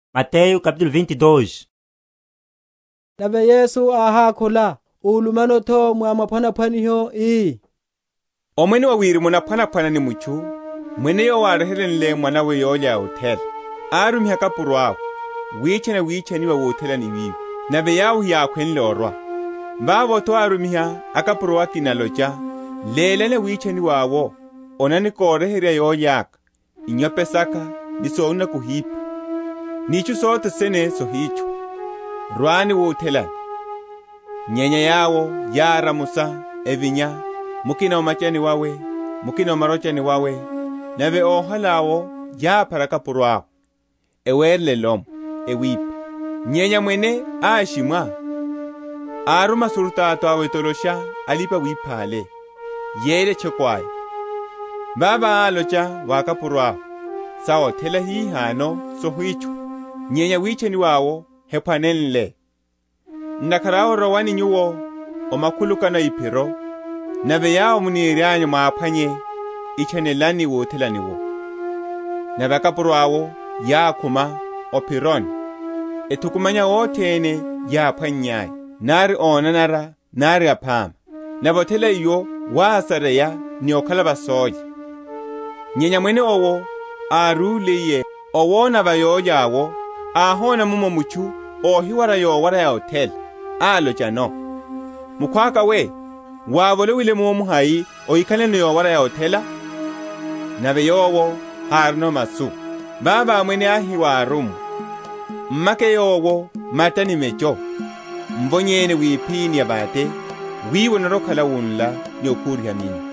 Niphwanaphwaniho na othela. Nave Yesu áhákhula, úlumano’tho mwa maphwanaphwaniho, ii, Omwene wa Wirimu onaphwanaphwana ni mutchu, mwene, yowo áryeheryenle mwanawe yólya ya othela, arumiha akapuro awe, witchana awitchaniwa wuthelani wiwo: nave yawo heyákhwenle orwa. Vavo’tho árumiha akapuro akina, alocha, Lélani awitchaniwa’wo, Onani, koryeherya yólya’ka: inyope saka, ni sonuna kohipha, ni itchu sothene sohitchwa: rwani wuthelani. Nyenya yawo yáramusa, evinya, mukina o’macha wawe; mukina o marochani wawe: nave óhala’wo yáphara akapuro awe, ewerela elomwe, ewipha. Nyenya mwene áshimwa; aruma asurutato awe etolosha alipa‐wipha’le, yeyela etchoko aya. Vavo álocha wa akapuro awe, Sa othela hihano sohitchwa, nyenya awitchaniwa’wo hephwanenle. Ntakhara awe rowani nyuwo o makhulukano a iphiro, nave yawo muniryanyu mwaphwanye, itchanelani wuthelani wu. Nave akapuro awo yákhuma o’phironi, ethukumanya othene yáphwannyaya, nari ónanara, nari aphama; nave othela iwo wásareya ni ókhala va sólya. Nyenya mwene owo árúliye, owona avayólya awo, áhona mummo mutchu óhiwara yowara ya othela: alochano, Mukhwaka we, wávolowile munno hai óhikhalano yowara ya othela? Nave yowo hárino masu. Vavo mwene áhi wa órummwa, M’make yowo mata ni mecho, mvonyeni wipiphini ya vate; wiwo onarwa‐okhala wunla ni okhuriha minno.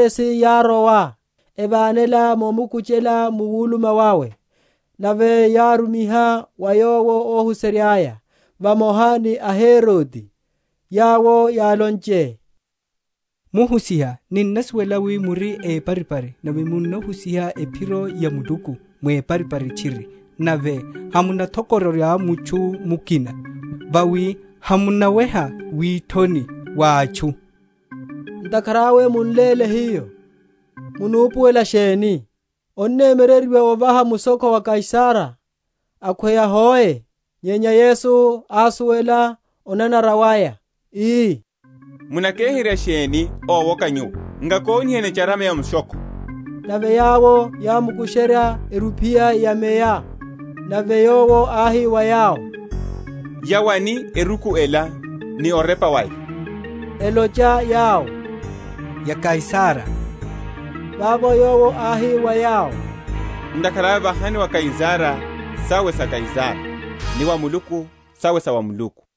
Vavo aFarisi yárowa, evánela momukukuchela mu wuluma wawe. Nave yárumiha wa Yowo óhuserya’ya, vamoha ni aHerode, yawo yálonche, Muhusiha, ninnasuwela wi muri éparipari, nave munnahusiha ephiro ya Muluku mweparipari tchiri, nave hamunathokororya mutchu mukina: vawi hamunaweha withoni wa atchu. Ntakhara awe mun’léle hiyo, munupuwela sheni? Onnemyereryiwa ovaha mushokho wa Kaisara, akhweya hoe? Nyenya Yesu ásuwela onanara waya, ii, Munakeherya sheni, ówoka nyuwo? Nkakoniheni echarama ya mushokho. Nave yawo yámkusherya erupiya ya meya. Nave Yowo áhi wa yawo, Ya wani eruku ela, ni orepa waya? Elocha yawo, Ya Kaisara. Vavo Yowo áhi wa yawo, Ntakhara awe vahani wa Kaisara sawe sa Kaisara, ni wa Muluku sawe sa Muluku.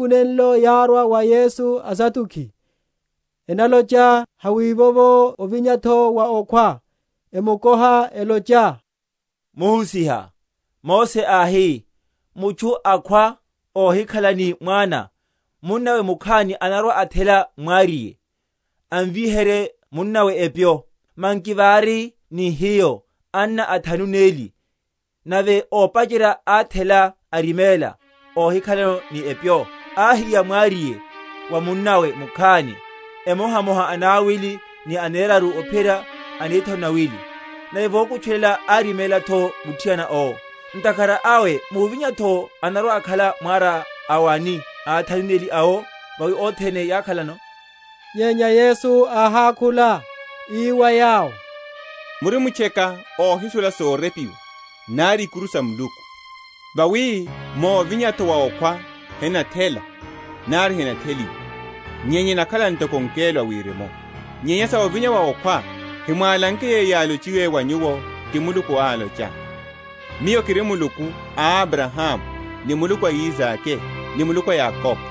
Nihiku nenlo yárwa wa Yesu aSaduki, enalocha hawívovo ovinya’tho wa okhwa; emukoha, elocha, Muhusiha, Mose áhi, Mutchu akhwa, ohikhala ni mwana, munnawe mukhani anarwa‐athela mwariye, amvíherye munnawe epyo. Manki vári ni hiyo anna athanu neli: nave ópacherya áthela, ariméla óhikhala ni epyo, ahiya mwariye wa munnawe mukhani; emohamoha anawili, ni aneraru, ophiyerya anethanu n’nawili. Nave vokutchulela áriméla’tho muthiana owo. Ntakhara awe muvinya’tho anarwa‐akhala mwara a wani a athanu neli awo? vawi othene yákhalano. Nyenya Yesu áhákhula, ii wa yawo, Murimtcheka ohisuwela sorepiwa, nari ikuru sa Muluku. Vawi muvinya’tho wa okhwa henathela, nari henatheliwa, nyenya enakhala ntoko angelo a Wirimu. Nyenya sa ovinya wa okhwa, hemwálanke yeyo yálochiwe wa nyuwo ti Muluku, alocha, Miyo kiri Muluku a Abrahamu, ni Muluku a Isake, ni Muluku a Yakobo?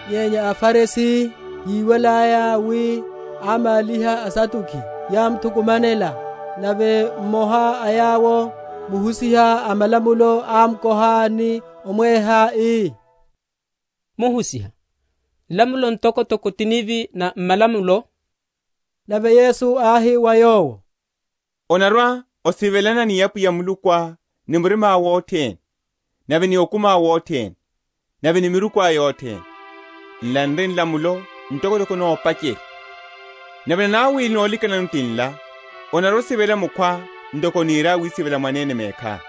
Nyenya aFarisi, yíwalaya wi ámáliha aSaduki, yámthukumanela. Nave mmoha a yawo, muhusiha a malamulo, ámkoha ni omweha ii, Muhusiha, nlamulo ntokotoko ti nivi na m’malamulo? Nave Yesu áhi wa Yowo, Onarwa‐osivelana ni Apwiya Mulukuá ni murimá wothene, nave ni okumiá wothene, nave ni mirikuá yothene. Nla n’ri nlamulo ntokotoko n’nopacherya. Nave nanawili nolikanano tinla, Onarwa‐osivela mukhwá ntoko onirá wisivela mwanene mekhá.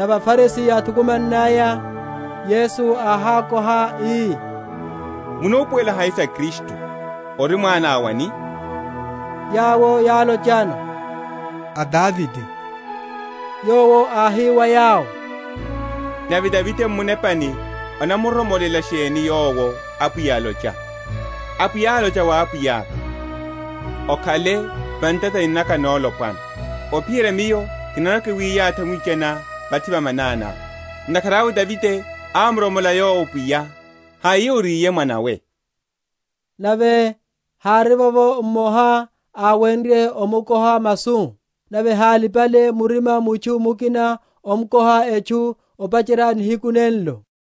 Nave aFarisi yáthukumannaya, Yesu áhákoha, ii, munupuwela hai sa Kristu? ori mwana a wani? Yawo yálochano, A Davide. Yowo áhi wa yawo, Nave Davide m’munepa anamuromolela sheni Yowo, Apwiya, alocha, Apwiya álocha wa Apwiyaka, Okhale va ntatani naka nolopwana, Ophiyerya Miyo kinarwa‐kiyathi amwichaniá vathi va mananiá. Ntakhara awe Davide ámuromola Yowo Pwiya, hai oriye mwanawe? Nave hárivovo mmoha áwenrye omwakhula masu. Nave hálipale murima mutchu mukina omkoha etchu opacherya nihiku nenlo.